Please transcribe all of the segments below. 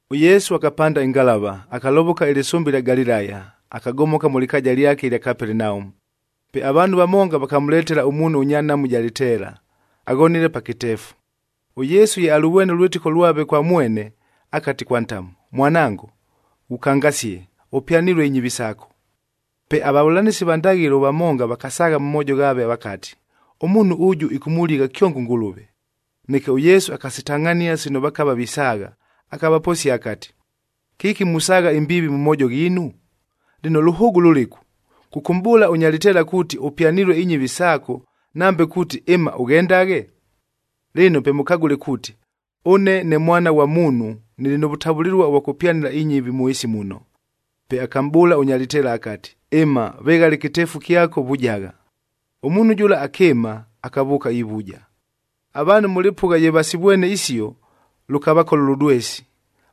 ɄYesu akapanda ɨngalava, akalovoka ɨlɨsʉmbe ɨlya Galilaya, akagomoka mʉ lɨkaaja lyake ɨlya Kapelenaumu. Pe avaanhu vamonga vakamʉletela ʉmuunhu ʉnya nhamu ɨja lɨteela, aghonile pa kɨteefu. ɄYesu ye alʉvwene ʉlwɨtɨko lwave kwa mwene, akati kwa ntamu, “Mwanango, ghukangasie! Ʉpyanilue inyɨvi saako.” Pe avavʉlanɨsi va ndaghɨlo vamonga vakasaagha mʉ moojo ghaave vakati, “Ʉmuunhu ʉjʉ ɨkʉmʉligha kyongo ʉNgʉlʉve!” Neke ʉYesu akasitangʼhania sino vakava visaagha, akavaposia akati, “Kɨki musaagha imbiivi mʉ moojo ghiinu? Lɨno, lʉhʉʉgʉ lʉlɨku? Kʉkʉmʼbʉʉla ʉnya lɨteela kuuti, ‘Ʉpyanilue inyɨvi saako,’ nambe kuuti, ‘Ɨma, ʉghendaghe’? Lɨno pe mʉkagʉle kuuti, ʉne ne Mwana ghwa Muunhu nɨlɨ nʉ vʉtavʉlɨlua ʉvwa kʉpyanɨla inyɨvi mʉ ɨɨsi muno.” Pe akamʼbʉʉla ʉnya lɨteela akati, “Ɨma, veghala ɨkɨteefu kyako, vujagha.” Ʉmuunhu jʉla akɨɨma, akavʉʉka ivuja. Avaanhu mʉ lɨpʉgha ye vasivwene isio, lʉkavakola ʉlʉdwesi,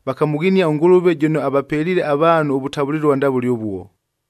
vakamʉghinia ʉNgʉlʉve jʉno avapeliile avaanhu ʉvʉtavʉlɨlua ndavʉle ʉvuo.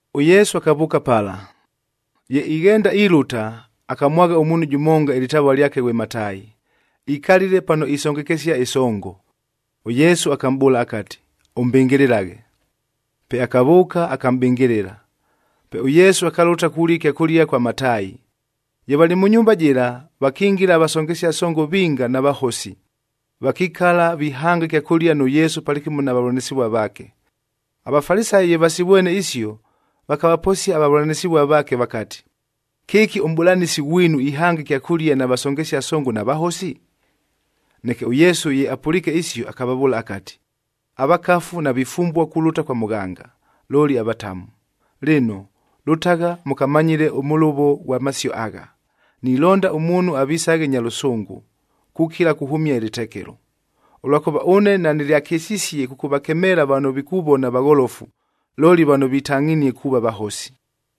ɄYesu akavʉʉka pala. Ye ighenda ilʉta, akamwagha ʉmuunhu jʉmonga, ɨlɨtavua lyake ghwe Mataayi, ikalile pano isongekesia ɨsongo. ɄYesu akamʼbʉʉla akati, “Ʉmbɨngɨlɨlaghe.” Pe akavʉʉka, akamʼbɨngɨlɨla. Pe ʉYesu akalʉta kulia ɨkyakʉlia kwa Mataayi. Ye valɨ mʉ nyumba jɨla, vakingila avasongesia songo vinga na vahosi, vakikala vihanga ɨkyakʉlia nʉ Yesu palɨkɨmo na vavʉlanɨsɨvua vaake. AVafalisayi ye vasivwene isio, vakavaposia avavʉlanɨsɨvua vaake vakati, “Kɨki ʉmʼbʉlanɨsi ghwinu ihanga ɨkyakʉlia na vasongesia songo na vahosi?” Neke ʉYesu ye apʉliike isio, akavavʉʉla akati, “Avakafu navifumbua kulʉta kwa mʉghanga, looli avatamu! Lɨno, lʉtagha mʉkamanyɨle ʉmʉlʉvo ghwa masio agha, ‘Nilonda ʉmuunhu avisaghe nya lʉsʉngʉ kukila kuhʉmia ɨlɨtekelo,’a ʉlwakʉva ʉne nanɨlyakɨsisie kʉkʉvakemeela vano vikuvona vagholofu, looli vano vitangʼhinie kuuva vahosi.”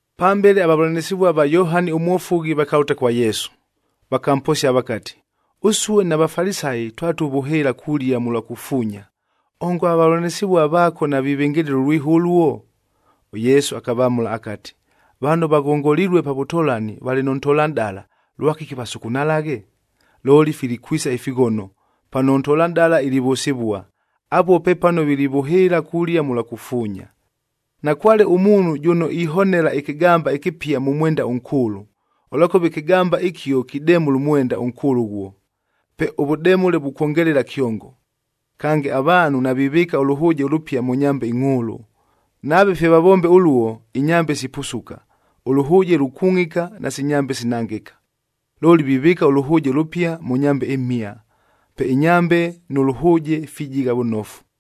Pambele avavʉlanɨsɨvua va Yohani ʉMwofughi vakalʉta kwa Yesu, vakamposia vakati, “Ʉsue na Vafalisayi twatuvʉhɨɨla kulia mʉlwa kufuunya,b ongo avavʉlanɨsɨvua vaako navivɨngɨlɨla ʉlwiho ʉluo?” ɄYesu akavamʉla akati, “Vano vaghongolilue pa vʉtolani valɨ nʉ ntolanʼdala, lwakɨki vasukunalaghe? Looli filikwisa ifighono, pano ʉntolanʼdala ilivʉsɨvua. Apuo pepano vilivʉhɨɨla kulia mʉlwa kufuunya. Nakwale ʉmuunhu jʉno ihonela ɨkɨgamba ɨkɨpia mʉ mwenda ʉnkʉʉlʉ, ʉlwakʉva ɨkɨgamba ɨkio kidemʉla ʉmwenda ʉnkʉʉlʉ ʉghuo, pe ʉvʉdemʉle vukwongelela kyongo. Kange, avaanhu navivɨɨka ʉlʉhʉʉjec ʉlʉpia mʉ nyambed ingʼhʉʉlʉ, nave fye vavombe ʉluo, inyambe sipusuka, ʉlʉhʉʉje lukungʼika nasi nyambe sinangɨka. Looli vivɨɨka ʉlʉhʉʉje ʉlʉpia mʉ nyambe imhia, pe inyambe nʉ lʉhʉʉje fijigha vʉnofu!”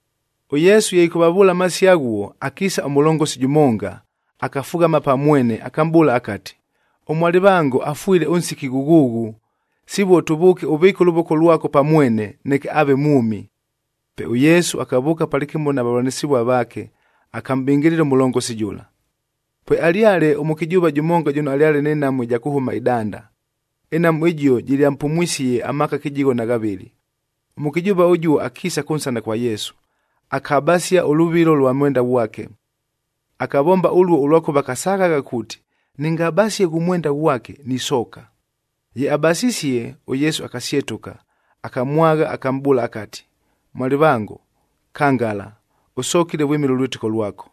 ɄYesu ye ɨkʉvavʉʉla amasio aghuo, akiisa ʉmʉlongosi jʉmonga, akafughama pa mwene, akamʼbʉʉla akati, “Ʉmwalɨvango afwile ʉnsiki ghʉghʉʉghʉ, sivuo tʉvʉʉke ʉvɨɨke ʉlʉvoko lwako pa mwene, neke aave mwʉmi.” Pe ʉYesu akavʉʉka palɨkɨmo na vavʉlanɨsɨvua vaake, akamʼbɨngɨlɨla ʉmʉlongosi jʉla. Pwealyale ʉmʉkɨjʉʉva jʉmonga jʉno alyale nɨ nhamu ɨja kʉhʉma ɨdanda. Ɨnhamu ɨjio jɨlyampumwisie amaaka kɨjigho na ghavɨlɨ. Ʉmʉkɨjʉʉva ʉjuo akiisa kʉnsana kwa Yesu, akabasia ʉlʉvilo ʉlwa mwenda ghwake. Akavomba ʉluo ʉlwakʉva akasaghagha kuuti, “Nɨngabasie ghʉ mwenda ghwake, nisooka.” Ye abasisie, ʉYesu akasyetʉka, akamwagha, akamʼbʉʉla akati, “Mwalɨvango, kangala! Ʉsokile vwɨmɨla ʉlwɨtɨko lwako!”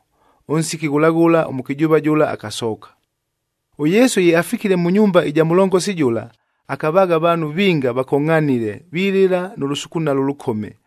Ʉnsiki ghʉla ghʉla, ʉmʉkɨjʉʉva jʉla akasooka. ɄYesu ye afikile mʉ nyumba ɨja mʉlongosi jʉla, akavaagha avaanhu vinga vakongʼhanile, vilɨla nʉ lʉsukunalo ʉlʉkome,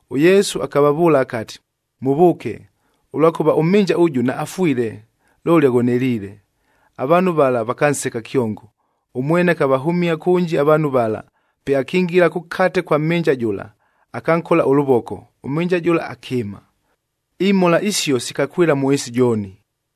ɄYesu akavavʉʉla akati, “Mʉvʉʉke! Ʉlwakʉva ʉmhɨnja ʉjʉ naafwile, looli aghoneliile!”f Avaanhu vala vakanseka kyongo. Ʉmwene akavahʉmia kʉnji avaanhu vala, pe akingila kʉkate kwa mhɨnja jʉla, akankola ʉlʉvoko, ʉmhɨnja jʉla akɨɨma. Imhola isio sikakwɨla mʉ ɨɨsi jooni.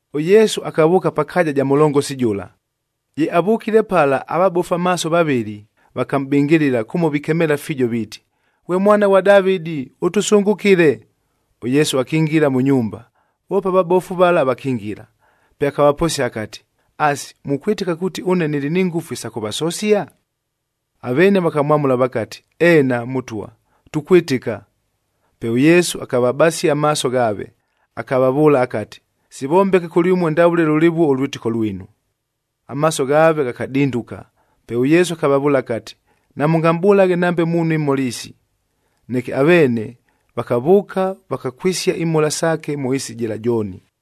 ɄYesu akavʉʉka pa kaaja ja mʉlongosi jʉla. Ye avʉkile pala avabofu amaaso vavɨlɨ, vakamʼbɨngɨlɨla kʉmo vikemeela fiijo viiti, “Ghwe Mwana ghwa Davɨdi,g ʉtʉsʉngʉkɨle!” ɄYesu akingila mʉ nyumba, voope avabofu vala vakingila. Pe akavaposia akati, “Asi, mukwɨtɨka kuuti ʉne nɨlɨ ni ngʉfu isa kʉvasosia?” Aveene vakamwamʉla vakati, “Eena, Mʉtwa! Tukwɨtɨka.” Pe ʉYesu akavabasia amaaso ghaave, akavavʉʉla akati, “Sivombeke kʉlyʉmue ndavʉle lʉlɨvuo ʉlwɨtɨko lwinu.” Amaaso ghaave ghakadinduka. Pe ʉYesu akavavʉʉla akati, “Namʉngamʼbʉlaghe nambe muunhu imhola isi!” Neke aveene vakavʉʉka, vakakwɨsia imhola saake mʉ ɨɨsi jɨla jooni.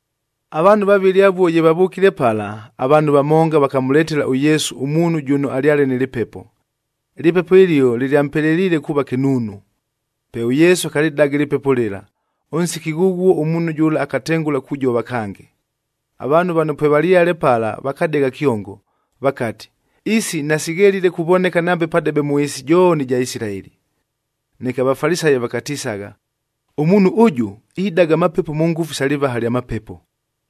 Avaanhu vavɨlɨ avuo ye vavʉkile pala, avaanhu vamonga vakamʉletela ʉYesu ʉmuunhu jʉno alyale nɨ lɨpepo. Ɨlɨpepo ɨlio lɨlyampeleliile kuuva kɨnuunu. Pe ʉYesu akalɨdaga ɨlɨpepo lɨla, ʉnsiki ghʉghuo ʉmuunhu jʉla akatengʉla kujova kange. Avaanhu vano pwevalyale pala vakadegha kyongo, vakati, “Isi nasighelile kuvoneka nambe padebe mʉ ɨɨsi jooni ɨja Isilaeli!” Neke aVafalisayi vakatisagha, “Ʉmuunhu ʉjʉ, idaga amapepo mʉ ngʉfu isa lɨvaha lya mapepo!”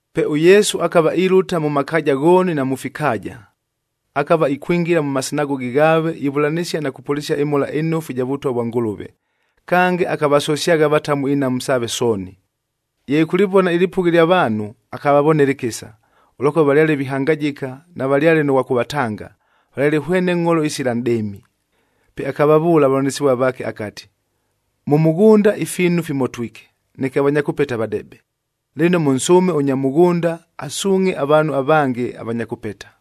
Pe ʉYesu akava ilʉta mʉ makaaja ghooni na mʉ fikaaja. Akava ikwingila mʉ masinagogi ghaave ivʉlanɨsia na kupʉlɨsia ɨMhola ɨNofu ɨja Vʉtwa vwa Ngʉlʉve, kange akavasosyagha avatamu inhamu saave sooni. Ye ɨkʉlɨvona ɨlɨpʉgha ɨlya vaanhu, akavavonela ɨkɨsa, ʉlwakʉva valyale vihangajɨka, navalyale nʉ ghwa kʉvatanga, valyale hwene ngʼholo isila nʼdɨɨmi. Pe akavavʉʉla avavʉlanɨsɨvua vaake akati, “Mʉ mʉghʉnda ifiinu fimotwike, neke avanya kʉpeta vadebe. Lɨno, mʉnsʉʉme ʉnya mʉghʉnda, asuungʼhe avaanhu avange avanya kʉpeta.”